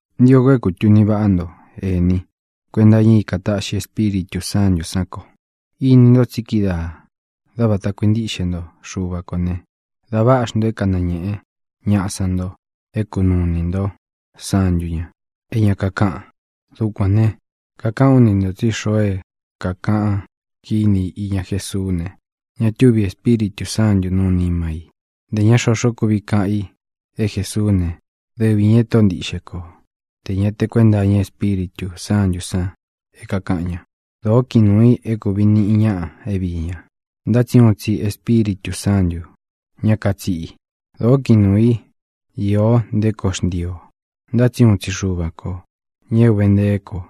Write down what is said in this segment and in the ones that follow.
Ntio ko é kūtuni váꞌa nto, ēní, kuenta iña i é kātaꞌxi Espíritū Sántū san ko. Ini nto tsi kídaā, dá vāta kuintíꞌxe nto Xuva kō ne, da váꞌa xnto é kanañēꞌe ñáꞌa san nto é kunuu inī ntó santu ña é ña kakáꞌan. Dukuān ne, kakaꞌán u ni ntō tsí xoo é kākaꞌan kíni i iña Jésuú ne, ña túvi Ēspíritū Sántū nuu nima i. Ntē ña xoxó kuvi kaꞌan i é Jesuú ne, dɨvi ñā e Tóꞌo ntiꞌxe ko, tē ña te kuénta iña Espíritū Sántū san é kākaꞌan ña. Dōó kiꞌin nuū i é kūvi niꞌi ñaꞌa é viī ña, ntá tsi uun tsi Espíritū Sántū, ña katsiꞌi. Dōó kiꞌin nuū í īo nté koo xntii ō, ntá tsi uun tsi Xuva ko, ñā é ūve ntee ko.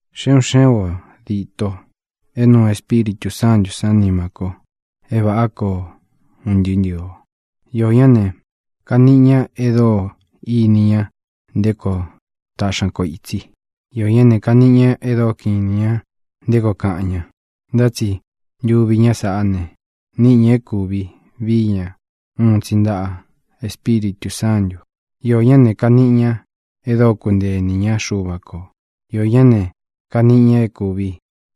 Xe un xé un ō díto é nuu Espíritū Sántū sán nima ko é vāꞌá ko un ntɨɨ́ ntɨɨ̄ o. Iō ñá ne, kaniꞌi ña e dóo ini ña nté koo taꞌxi ña ko ītsi. Iō ñá ne, kaniꞌi ña e dóo kiꞌin inī ña nté koo kaꞌan ña. Ntá tsi ntuvi ñá sāꞌá ne, níꞌi ña é kūvi vií ña uun tsi ntaꞌa Espíritū Sántū. Iō ñá ne, kaniꞌi ña e dóo kuntee inī ñá Xuva kō. Iō ñá ne, kaniꞌi ña é kūvi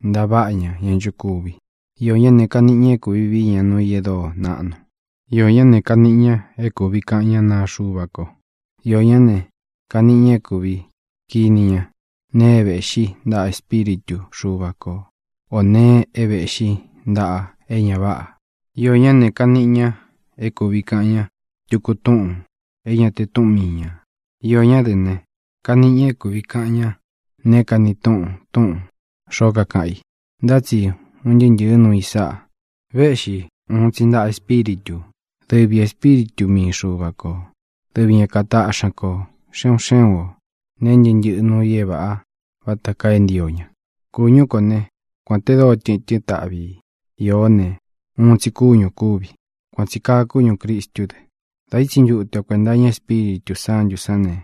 ntaváꞌa ña ña nchokuvi. Iō ñá ne, kaniꞌi ña é kūvi vii ña nuu i e dóo naꞌnu. Iō ñá ne, kaniꞌi ña é kūvi kaꞌan ñá naa Xuva ko. Iō ñá ne, kaniꞌi ña é kūvi kiní ña nee é vēꞌxí ntaꞌa Espíritu Xuva ko ō nee é vēꞌxí ntaꞌa é ña váꞌā. Iō ñá ne, kaniꞌi ña é kūvi kaꞌan ña tuku túꞌūn é ña te túꞌun mii ñā. Iō ñá dɨ ne, kaniꞌi ña é kūvi kaꞌan ña neé kani túꞌun túꞌūn xoó kakaꞌan i. Ntá tsi un ntɨɨ́ ntɨ̄ɨ́ nuu i sáꞌa vēꞌxi uun tsi ntaꞌa Espíritū, dɨvi Ēspíritu mii Xuva kō. Dɨvi ña kataꞌxi ña kō, xe un xé un ō, neé ntɨꞌɨ́ ntɨꞌɨ nuu i é vāꞌa vata kaa é ntio ña. Kūñú kō né, kuān te dóo tɨtɨ́n taꞌvi i īó ne, uun tsi kúñū kúvi. Kuān tsi kaa kúñū Cristú dɨ. Dā ítsi ntute o kuēnta iña Espíritū Sántū sán ne,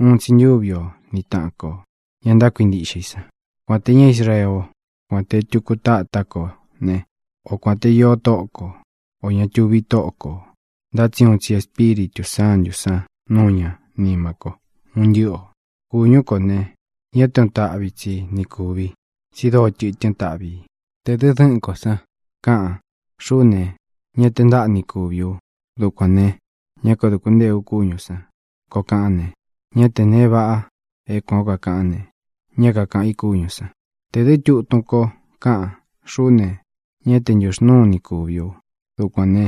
uun tsi ntúvi o ni tāꞌan ko, ña ntákuintiꞌxe i san. Kuān te ñá Israeé o, kuān te tuku tátá kō né, o kuān te io tóꞌo ko, ō ña tuvi tóꞌo kō, ntá tsi úun tsi Ēspíritū Sántū san núu ña nima ko, un ntɨ́ꞌɨ ō. Kūñú ko ne, ña té uun táꞌvi tsi ni kūvi, tsi dóo tɨtɨ́n taꞌvi ī. Tē dɨ dɨ́ꞌɨn kō san káꞌan: “Xuꞌú ne, ñá te ntaꞌa ni kūvi u; dukuān ne, ñá kaduku ntée u kúñū san”, koo kaꞌán ne, ñá tē nee vaꞌa é kuān ó kakaꞌán ne, ña kakaꞌán ka i kúñū san. Tē dɨ́ tutun ko káꞌan: “Xuꞌú ne, ñá te ntūxnúu ni kūvi u; dukuān ne,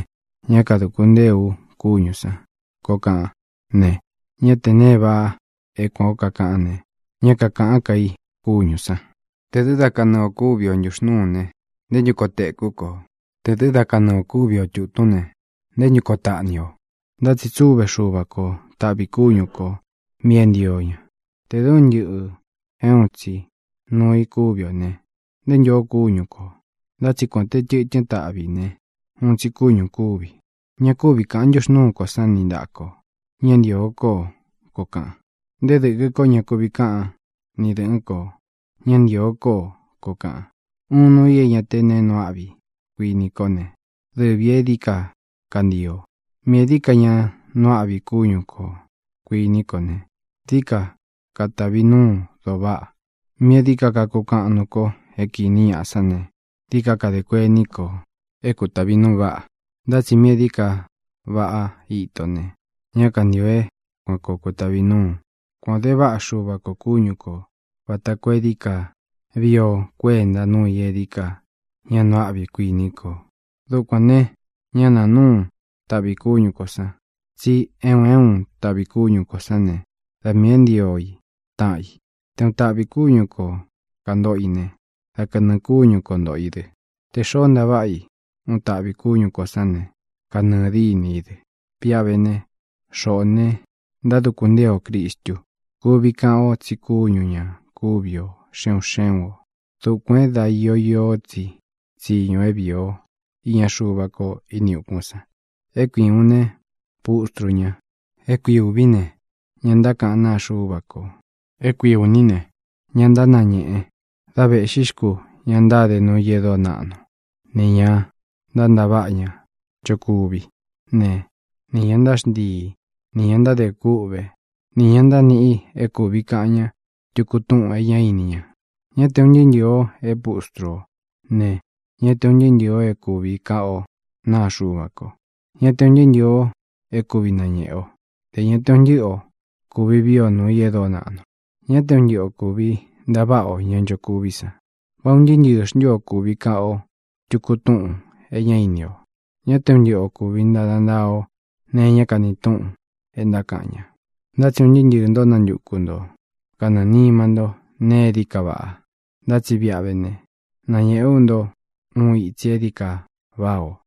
ñá kadūku ntée u kúñū san”, koo kaꞌán ne, ñá tē ne váꞌa é kuān ó kakaꞌán ne, ña kakaꞌán ka i kúñū san. Tē dɨ́ da kanɨɨ ō kúvi o ntūxnúū ne, ¿nté ntu koo teku ko? Tē dɨ́ da kanɨɨ ō kúvi o tūtún ne, ¿nté ntu koo taꞌni o? Ntá tsi tsúve Xuva ko taꞌvī kúñu kō mí e ntío ña. Tē dɨ́ un ntɨꞌɨ̄ é uun tsi nuu i kúvi ō ne, ¿nté ntū ó kúñu kō? Ntá tsi kuān te tɨtɨ́n taꞌvi ī ne, uun tsi kúñū kúvi. Ña kúvi kāꞌan ntúxnūú kō sán ni ntāꞌa ko: “Ña ntīo kó o”, koo kaꞌan. Nté dɨ̄kɨ kó ña kuvi káꞌan ni dɨ̄ꞌɨ́n kō: “Ñá ntīo kó o”, koo kaꞌan. Uun nuu i é ña té nee nuu áꞌvi, kuiní kō né, dɨvī e dií ka kantio. Míꞌī e dií ka ña nuu áꞌvi kúñu kō, kuiní kō ne, dií ka katavi núu doo váꞌa. Míꞌī e dií ka kakukaꞌan nuú kō é kīni ñaꞌa sán ne, dií ka kadē kuení ko é kutāvi nuu váꞌa, ntá tsi míꞌī e dií ka váꞌa ito ne, ñá kantio é kuān koo kutavi núu. Kuān o de váꞌa Xuva kō kúñu kō, vata koo é dií ka víi o kuēnta nuu i e dií ka ña nuu áꞌvi, kuiní ko. Dukuān ne, ñá nāa núu taꞌvī kúñu kō san, tsí e un é un taꞌvī kúñu kō sán ne, da miī é ntio i taꞌan i. Te uun taꞌvī kúñu ko kāntoꞌo i ne, dá kanɨɨ̄ kúñu ko ntōꞌo i dɨ. Tē xoó ntaváꞌa i uun taꞌvī kúñū sán ne, kanɨɨ dîni í dɨ. Viꞌa vé ne, xoꞌō ne, ntáduku ntée o Crīstu. Kuvi kaꞌan o tsi kúñu ñā kúvi ō xe un xé un ō. Dukuān é da io īó tsi tsiñu é viī ó iña Xuva ko ini ukún san: é kui ūun ne, pustru ña; é kui ūví ne, ña ntákaꞌán naa Xúva kō; é kui ūní ne, ña ntánañēꞌe; dá vēꞌxí xku ña ntáde nuu i e dóo naꞌnu, nī ña ntántaváꞌa ña nchokuví ne, nī ña ntáxntii, nī ña ntádē kûꞌvé, nī ña ntániꞌi é kūvi kaꞌan ña tuku túꞌūn e ñá ini ña. Ñá te ūn ntɨɨ́ ntɨɨ̄ o é pustru o ne, ñá te ūn ntɨɨ́ ntɨɨ̄ o é kūvi kaꞌan ó naa Xuva ko. Ñá te ūn ntɨɨ́ ntɨɨ̄ o é kuvi nañēꞌe ó, ntē ña te un ntɨ́ꞌɨ o kūvi vií o nūu i e dóo naꞌnu. Ñá te un ntɨꞌɨ o kūvi ntaváꞌa o ña nchokuví san. ¿Vá un ntɨɨ́ ntɨɨ̄ xntu ó kuvi kaꞌan ó tuku túꞌūn é ña íni o? Ñá te un ntɨꞌɨ ō kuvi ntada ntaa o neé kani túꞌun e ntákaꞌan ña. Ntá tsi un ntɨɨ́ ntɨɨ̄ ntó nantuku nto kanɨɨ̄ nima ntó nēe e dií ka vaꞌa. Ntá tsi víꞌa vé ne, nañēꞌe ú nto uun itsi e dií ka váꞌā o.